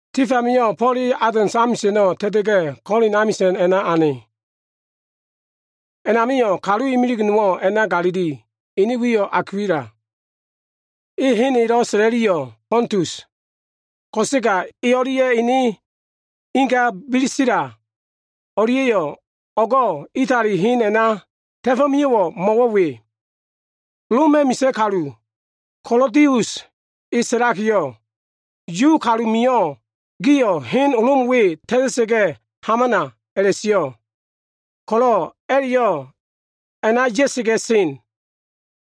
Tif amio꞉, Fo꞉l e Atens amisa꞉no꞉ ta꞉ta꞉ga꞉, Kolin amisa꞉na ane. A꞉namio꞉ kalu imilig nowo꞉ a꞉na galili, ene wiyo꞉ Akwila. Hen elo꞉ sa꞉la꞉liyo꞉, Fontus, ko꞉sega e o꞉lia꞉ ene inga Bisila o꞉lia꞉yo꞉ o꞉go꞉ Itali hen a꞉na ta꞉fo꞉ mio꞉. Mo꞉wo꞉, Loma꞉ misa꞉ kalu, Kalodius e sa꞉lakiyo꞉, “Yu kalu mio꞉, gio꞉ Lom hen we ta꞉ta꞉sa꞉ga꞉ hamana” a꞉la꞉sio꞉ ko꞉lo꞉ a꞉la꞉yo꞉ a꞉na ya꞉sa꞉ga꞉ sen.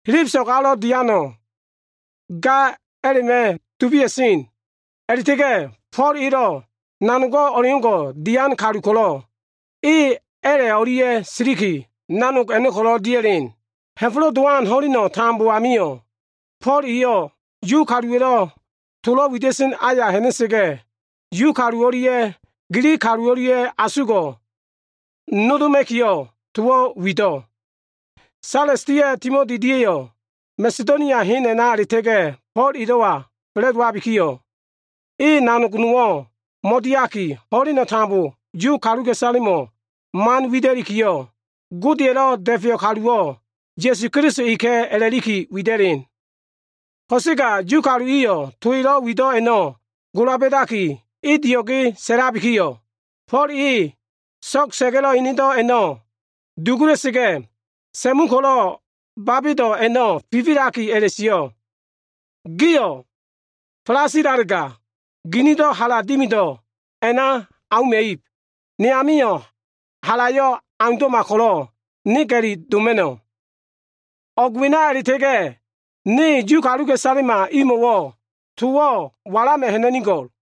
Helebeso꞉g alo꞉ diano꞉ ga a꞉la꞉ma꞉ dubia꞉sen a꞉la꞉ta꞉ga꞉ Fo꞉l elo꞉ nanogo꞉ o꞉leo꞉ngo꞉ dian kalu ko꞉lo꞉ e a꞉la꞉ o꞉lia꞉ siliki, nanog a꞉no꞉ ko꞉lo꞉ dia꞉len. Ha꞉fo꞉lo꞉ Dowan ho꞉leno꞉ tambo amio꞉, Fo꞉l eyo꞉ Yu kaluwa꞉lo꞉ tolo꞉ wida꞉sen aya ha꞉na꞉sa꞉ga꞉, Yu kalu o꞉lia꞉ Gilig kalu o꞉lia꞉yo꞉ asugo꞉ nodoma꞉kiyo꞉, towo꞉ wido꞉. Sales dia꞉ Timoti dia꞉yo꞉ Masedonia hena a꞉la꞉ta꞉ga꞉ Fo꞉l elo꞉wa fa꞉la꞉dowabikiyo꞉, e nanog nowo꞉ mo꞉diaki, ho꞉leno꞉ tambo Yu kaluka꞉isalemo꞉wo꞉ man wida꞉likiyo꞉, Godeya꞉lo꞉ Da꞉feyo꞉ kaluwo꞉, Ya꞉su Keliso eka꞉ a꞉la꞉liki wida꞉len. Ko꞉sega Yu kalu iliyo꞉ to man elo꞉ wido꞉ a꞉no꞉ gola ba꞉daki, e dio꞉ge sa꞉labikiyo꞉, Fo꞉l eyo꞉ so꞉g sa꞉ga꞉lo꞉ enedo꞉ a꞉no꞉ duda꞉sa꞉ga꞉ hena꞉mu ko꞉lo꞉ babedo꞉ a꞉no꞉ fifilaki a꞉la꞉sio꞉, “Gio꞉ falasilalega, ginido꞉ hala dimido꞉ a꞉na auma꞉ib. Ne amio꞉ halayo꞉ aundo꞉ma ko꞉lo꞉ ne ga꞉li doma꞉no꞉. O꞉g wena a꞉la꞉ta꞉ga꞉yo꞉, ne Yu kaluka꞉isalema imo꞉wo꞉ towo꞉ walama꞉ ha꞉na꞉nigo꞉l.”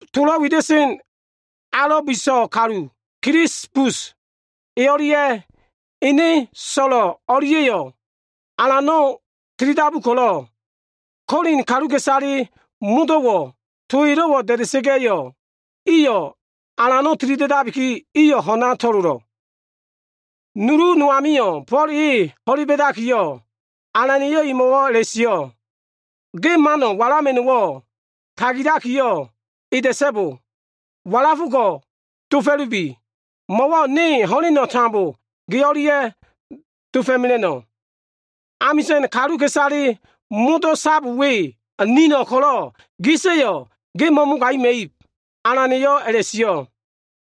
Tolo꞉ wida꞉sen alo꞉ bo꞉fo꞉lowan kalu, Kilisbus, e o꞉lia꞉ ene so꞉lo꞉ o꞉lia꞉yo꞉ Alano꞉ tilidabu ko꞉lo꞉, Kolin kaluka꞉isale modo꞉wo꞉, to elo꞉wo꞉ da꞉da꞉sa꞉ga꞉yo꞉, iyo꞉lo꞉ Alano꞉ tilida꞉dabikiyo꞉, iyo꞉ ho꞉n amio꞉ a꞉na to꞉lolo꞉. Nulu no amio꞉, Fo꞉l e ho꞉le ba꞉dakiyo꞉, Alana꞉yo꞉ emo꞉wo꞉ a꞉la꞉sio꞉, “Ge mano꞉ walama꞉no꞉wo꞉, tagilakiyo꞉ eda꞉so꞉bo. Walafo꞉ ko꞉ dofo꞉lubi. Mo꞉wo꞉ ne ho꞉leno꞉ tambo ge o꞉lia꞉ dofo꞉mela꞉no꞉. Amisa꞉n kaluka꞉isale modo꞉ sab we nino꞉ ko꞉lo꞉ gisa꞉yo꞉ ge mo꞉mogagima꞉ib” Alana꞉yo꞉ a꞉la꞉sio꞉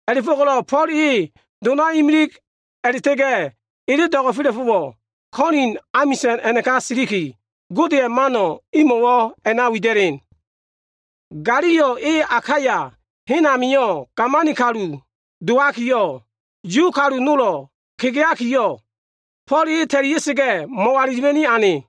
A꞉la꞉fo꞉ko꞉lo꞉ Fo꞉l e donayo꞉ imilig a꞉la꞉ta꞉ga꞉ ele do꞉go꞉fela꞉fo꞉wo꞉ Kolin amisa꞉n a꞉naka siliki, Godeya꞉ to mano꞉ imo꞉wo꞉ a꞉na wida꞉len. Galio e Akaya hen a꞉namio꞉ gamani kalu dowakiyo꞉, Yu kalu nolo꞉ kegeakiyo꞉, Fo꞉l e ta꞉lia꞉sa꞉ga꞉, mo꞉walilima꞉ni ane.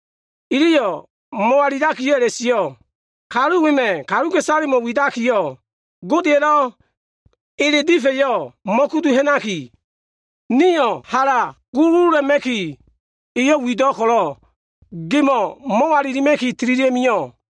Iliyo꞉ mo꞉walilakiyo꞉ a꞉la꞉sio꞉, “Kalu wema꞉yo꞉ kaluka꞉isalemo꞉ widakiyo꞉, Godeya꞉lo꞉ ele saefa꞉yo꞉ mo꞉kudu ha꞉naki, nio꞉ hala guluguluma꞉kiyo꞉ e wido꞉ ko꞉lo꞉, gemo꞉ mo꞉walilima꞉ki tililia꞉ mio꞉.”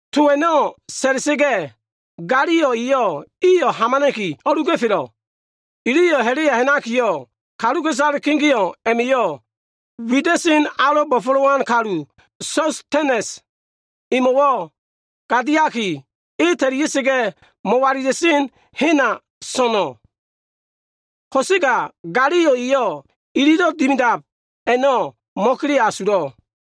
To a꞉no꞉ sa꞉la꞉sa꞉ga꞉, Galio eyo꞉ iyo꞉ hamana꞉ki, o꞉luga꞉felo꞉ Iliyo꞉ ha꞉la꞉ya ha꞉nakiyo꞉, kaluka꞉isale kegeo꞉ a꞉ma꞉yo꞉ wida꞉sen alo꞉ bo꞉fo꞉lowan kalu, Sostenes emo꞉wo꞉ gadiakiyo꞉, e ta꞉lia꞉sa꞉ga꞉, mo꞉walila꞉sen hena so꞉no꞉. Ko꞉sega Galio eyo꞉ ililo꞉ dimidab a꞉no꞉ mo꞉kele asulo꞉.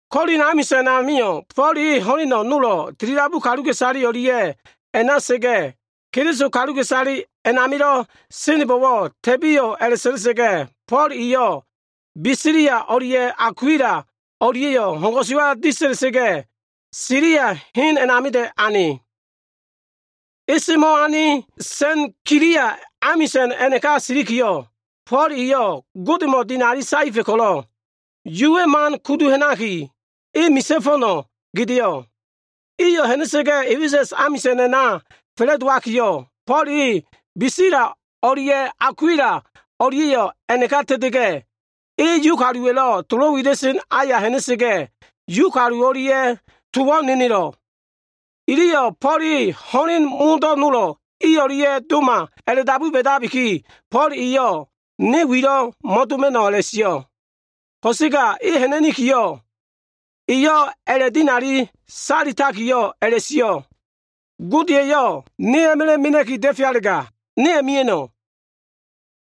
Kolin amisa꞉n amio꞉, Fo꞉l e ho꞉len nolo꞉ tilidabu kaluka꞉isale o꞉lia꞉ a꞉na sa꞉ga꞉, Keliso kaluka꞉isale a꞉namilo꞉ senbo꞉wo꞉ ta꞉biyo꞉ a꞉la꞉sa꞉la꞉sa꞉ga꞉, Fo꞉l eyo꞉, Bisila o꞉lia꞉ Akwila o꞉lia꞉yo꞉ ho꞉n ko꞉suwa disa꞉la꞉sa꞉ga꞉, Silia hen a꞉namida꞉ ane. E semo꞉ ane Senkilia amisa꞉n a꞉naka o꞉silikiyo꞉, Fo꞉l eyo꞉ Godemo꞉ dinali saefa꞉ ko꞉lo꞉, Yuwa꞉ man kudu ha꞉naki, ene misa꞉ fo꞉no꞉ gedeo꞉. Iyo꞉ ha꞉na꞉sa꞉ga꞉ A꞉fesa꞉s amisa꞉n a꞉na fa꞉la꞉dowakiyo꞉, Fo꞉l e Bisila o꞉lia꞉ Akwila o꞉lia꞉yo꞉ a꞉naka ta꞉ta꞉ga꞉, e Yu kaluwa꞉lo꞉ tolo꞉ wida꞉sen aya ha꞉na꞉sa꞉ga꞉, Yu kalu o꞉lia꞉ towo꞉ nenelo꞉. Iliyo꞉ Fo꞉l e ho꞉len modo꞉ nolo꞉ i o꞉lia꞉yo꞉ o꞉doma a꞉la꞉dabu ba꞉dabikiyo꞉, Fo꞉l eyo꞉ ne wilo꞉ mo꞉doma꞉no꞉ a꞉la꞉sio꞉. Ko꞉sega e ha꞉na꞉nikiyo꞉, eyo꞉ a꞉la꞉dinali saetakiyo꞉ a꞉la꞉sio꞉, “Gode eyo꞉ ne a꞉ma꞉la꞉ mena꞉ki da꞉fealega, ne a꞉mia꞉no꞉.”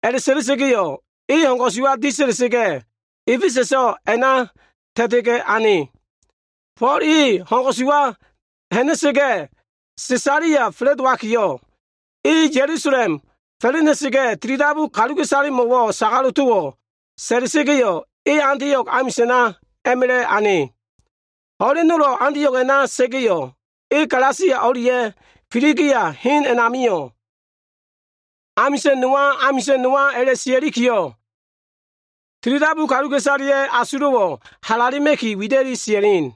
A꞉la꞉sa꞉la꞉sa꞉ga꞉yo꞉, e ho꞉n ko꞉suwa disa꞉la꞉sa꞉ga꞉, A꞉fesa꞉so꞉ a꞉na ta꞉ta꞉ga꞉ ane. Fo꞉l e ho꞉n ko꞉suwa ha꞉na꞉ga꞉, Sesalia fa꞉la꞉dowakiyo꞉, e Ya꞉lusalem fa꞉la꞉na꞉sa꞉ga꞉, tilidabu kaluka꞉isalemo꞉wo꞉ sagalo꞉ towo꞉ sa꞉la꞉sa꞉ga꞉yo꞉, e Antio꞉g amisa꞉na a꞉ma꞉la꞉ ane. Ho꞉len nolo꞉ Antio꞉g a꞉na sa꞉ga꞉yo꞉, e Galasia o꞉lia꞉ Filigia hen a꞉namio꞉, amisa꞉n nowa, amisa꞉n nowa a꞉la꞉sia꞉likiyo꞉, tilidabu kaluka꞉isaleya꞉ asulo꞉wo꞉ halale alitakiyo꞉ wida꞉li sia꞉len.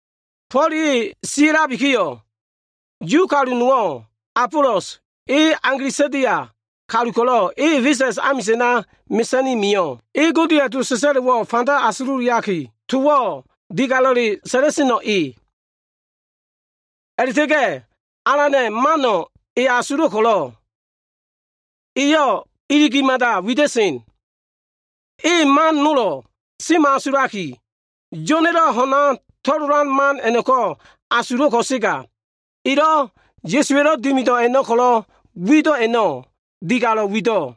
Fo꞉l e sia꞉labikiyo꞉, Yu kalu nowo꞉, Abolos e Alegsandia kalu ko꞉lo꞉ e A꞉fesa꞉s amisa꞉na mesa꞉ni mio꞉. E Godeya꞉ to sa꞉sa꞉lo꞉wo꞉ fanda asululiaki, towo꞉ digalo꞉lelo꞉ sa꞉la꞉seno꞉ e. A꞉la꞉ta꞉ga꞉ Alana꞉ man a꞉no꞉ e asulo꞉ ko꞉lo꞉, eyo꞉ iligi mada wida꞉sen. E man nolo꞉ semo꞉asulaki, Yo꞉na꞉lo꞉ ho꞉n amilo꞉ to꞉lolan man a꞉no꞉ko꞉ asulo꞉ ko꞉sega, elo꞉ Ya꞉suwa꞉lo꞉ dimido꞉ man ko꞉lo꞉ wido꞉ a꞉no꞉ digalo꞉ wido꞉.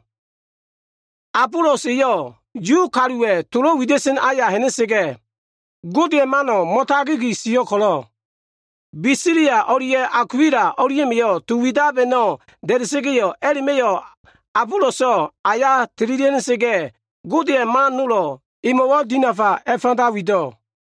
Abolos eyo꞉ Yu kaluwa꞉lo꞉ tolo꞉ wida꞉sen aya ha꞉na꞉sa꞉ga꞉, Godeya꞉ mano꞉ mo꞉tagigi sio꞉ ko꞉lo꞉, Bisila o꞉lia꞉ Akwila o꞉lia꞉ma꞉yo꞉ to man widab a꞉no꞉ da꞉da꞉sa꞉ga꞉yo꞉, a꞉la꞉ma꞉yo꞉ Aboloso꞉ aya tililia꞉ ha꞉na꞉sa꞉ga꞉, Godeya꞉ man nolo꞉lo꞉ emo꞉wo꞉ dinafa a꞉fanda wido꞉.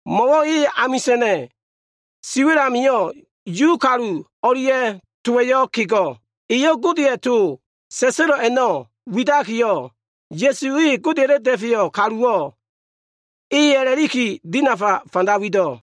Mo꞉wo꞉ e amisa꞉na꞉ siwa꞉l amio꞉, Yu kalu o꞉lia꞉ towa꞉yo꞉ kego꞉. Eyo꞉ Godeya꞉ to sa꞉sa꞉lo꞉ a꞉no꞉ widakiyo꞉, Ya꞉su e Godeya꞉lo꞉ Da꞉feyo꞉ Kaluwo꞉ eka꞉ a꞉la꞉liki, dinafa fanda wido꞉.